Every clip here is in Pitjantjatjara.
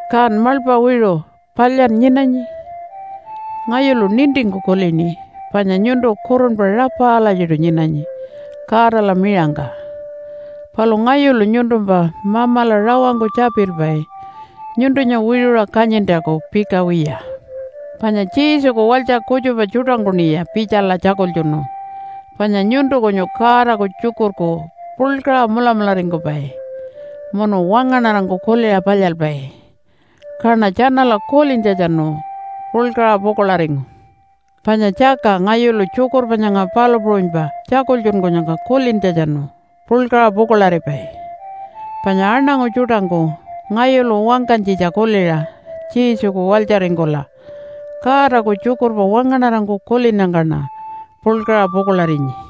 Kan maḻpa wiṟu, palyan nyinanyi? Ngayulu nintingku kulini panya nyuntu kurunpa rapa alatjiṯu nyinanyi Godala miṟangka. Palu ngayulu nyuntumpa Mamala rawangku tjapilpai nyuntunya wiṟuṟa kanyintjaku pika wiya. Panya Jesuku walytja kutjupa tjuṯangkuṉiya pitjala tjakultjunu panya nyuntu kunyu Godaku tjukurku puḻkaṟa mulamularingkupai munu wangaṉarangku kuliṟa palyalpai. Kaṉa tjanala kulintjatjanu puḻkaṟa pukuḻaringu. Panya tjaka ngayulu tjukurpa nyanga palu puṟunypa tjakultjunkunyangka kulintjatjanu puḻkaṟa pukuḻaripai, panya aṉangu tjuṯangku ngayulu wangkanytjitja kuliṟa Jesuku walytjaringkula Godaku tjukurpa wangaṉarangku kulinnyangkaṉa puḻkaṟa pukuḻarinyi.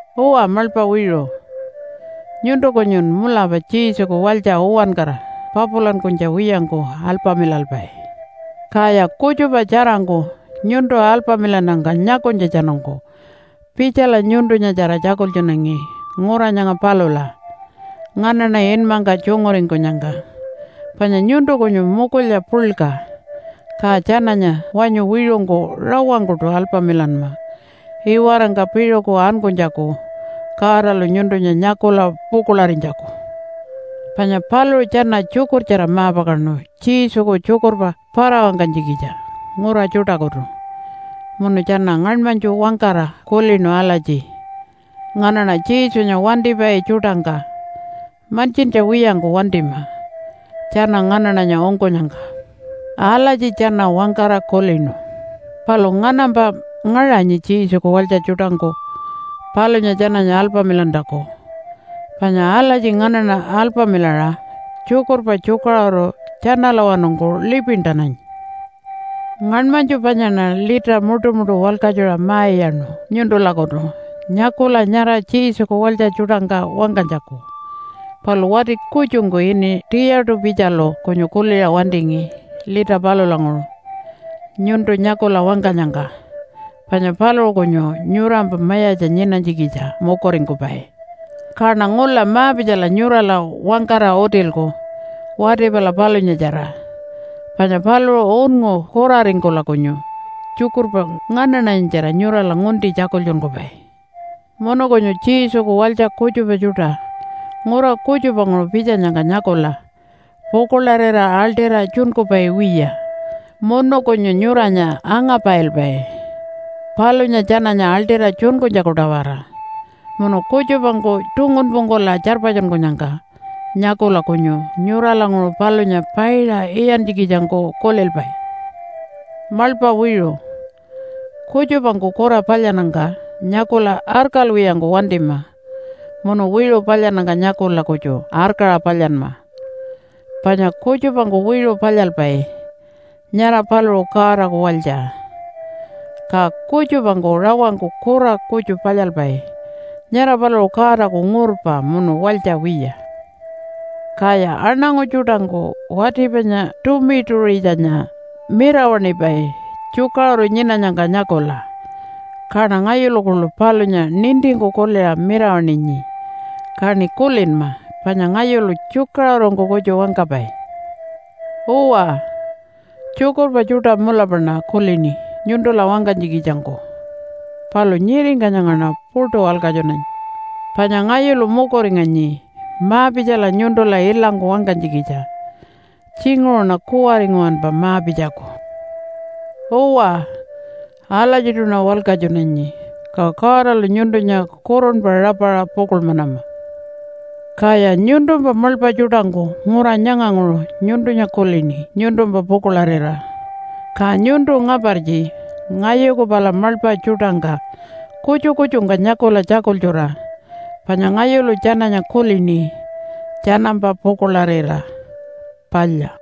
Uwa, maḻpa wiṟu, nyuntu kunyun mulapa Jesuku walytja uwankara papulankunytja wiyangku alpamilalpai. Kaya kutjupa tjarangku nyuntu alpamilannyangka nyakunytjatjanungku pitjala nyuntunyatjara tjakultjunangi ngura nyanga palula nganaṉa inmangka tjunguringkunyangka, panya nyuntu kunyu mukulya puḻka. Ka tjananya wanyu wiṟungku rawangkuṯu alpamilanma iwarangka piṟuku ankunytjaku Godalu nyuntunya nyakula pukuḻarinytjaku. Panya paluṟu tjana tjukurtjara ma-pakaṉu Jesuku tjukurpa para-wangkanytjikitja ngura tjuṯakutu. Munu tjana ngaṉmanytju wangkara kulinu alatji, “Nganaṉa Jesunya wantipai tjuṯangka mantjintja wiyangku wantima tjana nganaṉanya ungkunyangka.” Alatji tjana wangkara kulinu. Palu nganampa ngaṟanyi Jesuku walytja tjuṯangku palunya tjananya alpamilantjaku. Panya alatji nganaṉa alpamilaṟa tjukurpa tjukaṟuru tjanalawanungku lipintananyi. Ngaṉmanytju panyaṉa lita muṯumuṯu walkatjuṟa ma-iyaṉu nyuntulakutu nyakula nyara Jesuku walytja tjuṯangka wangkanytjaku. Palu wati kutjungku ini Tiyatu-pitjalu kunyu kuliṟa wantingi lita palulanguṟu nyuntu nyakula wangkanyangka, panya paluṟu kunyu nyurampa mayatja nyinanytjikitja mukuringkupai. Kaṉa ngula ma-pitjala nyurala wangkara utilku wati pala palunyatjara. Panya paluṟu unngu kuraringkula kunyu tjukurpa nganaṉanyatjara nyurala ngunti tjakultjunkupai. Munu kunyu Jesuku walytja kutjupa tjuṯa ngura kutjupanguṟu pitjanyangka nyakula pukuḻarira aḻṯira tjunkupai wiya munu kunyu nyuranya angapailpai palunya tjananya aḻṯira tjunkunytjaku-tawara, munu kutjupangku tungunpungkula tjarpatjunkunyangka nyakula kunyu nyuralanguṟu palunya paiṟa iyantjikitjangku kulilpai. Maḻpa wiṟu, kutjupangku kura palyannyangka nyakula arkalwiyangku wantima munu wiṟu palyannyangka nyakula kutju arkaṟa palyanma. Panya kutjupangku wiṟu palyalpai, nyara paluṟu Godaku walytja. Ka kutjupangku rawangku kura kutju palyalpai, nyara paluṟu Godaku ngurpa munu walytja wiya. Kaya aṉangu tjuṯangku wati panya Tumitu-ṟitjanya mirawaṉipai tjukaṟuru nyinanyangka nyakula. Kaṉa ngayulu kuḻu palunya nintingku kuliṟa mirawaṉinyi, kaṉi kulinma panya ngayulu tjukaṟurungku kutju wangkapai. Uwa, tjukurpa tjuṯa mulapaṉa kulini nyuntula wangkanytjikitjangku palu nyiringka nyangaṉa puṯu walkatjunanyi. Panya ngayulu mukuringanyi ma-pitjala nyuntula ilangku wangkanytjikitja. Tjinguṟuṉa kuwari nguwanpa ma-pitjaku. Uwa, alatjiṯuṉa walkatjunanyi. Ka Godalu nyuntunya kurunpa rapaṟa pukuḻmanama. Kaya nyuntumpa maḻpa tjuṯangku ngura nyanganguṟu nyuntunya kulini nyuntumpa pukuḻarira. Ka nyuntu ngapartji ngayuku pala maḻpa tjuṯangka kutju kutjungka nyakula tjakultjura, panya ngayulu tjananya kulini tjanampa pukuḻarira. Palya!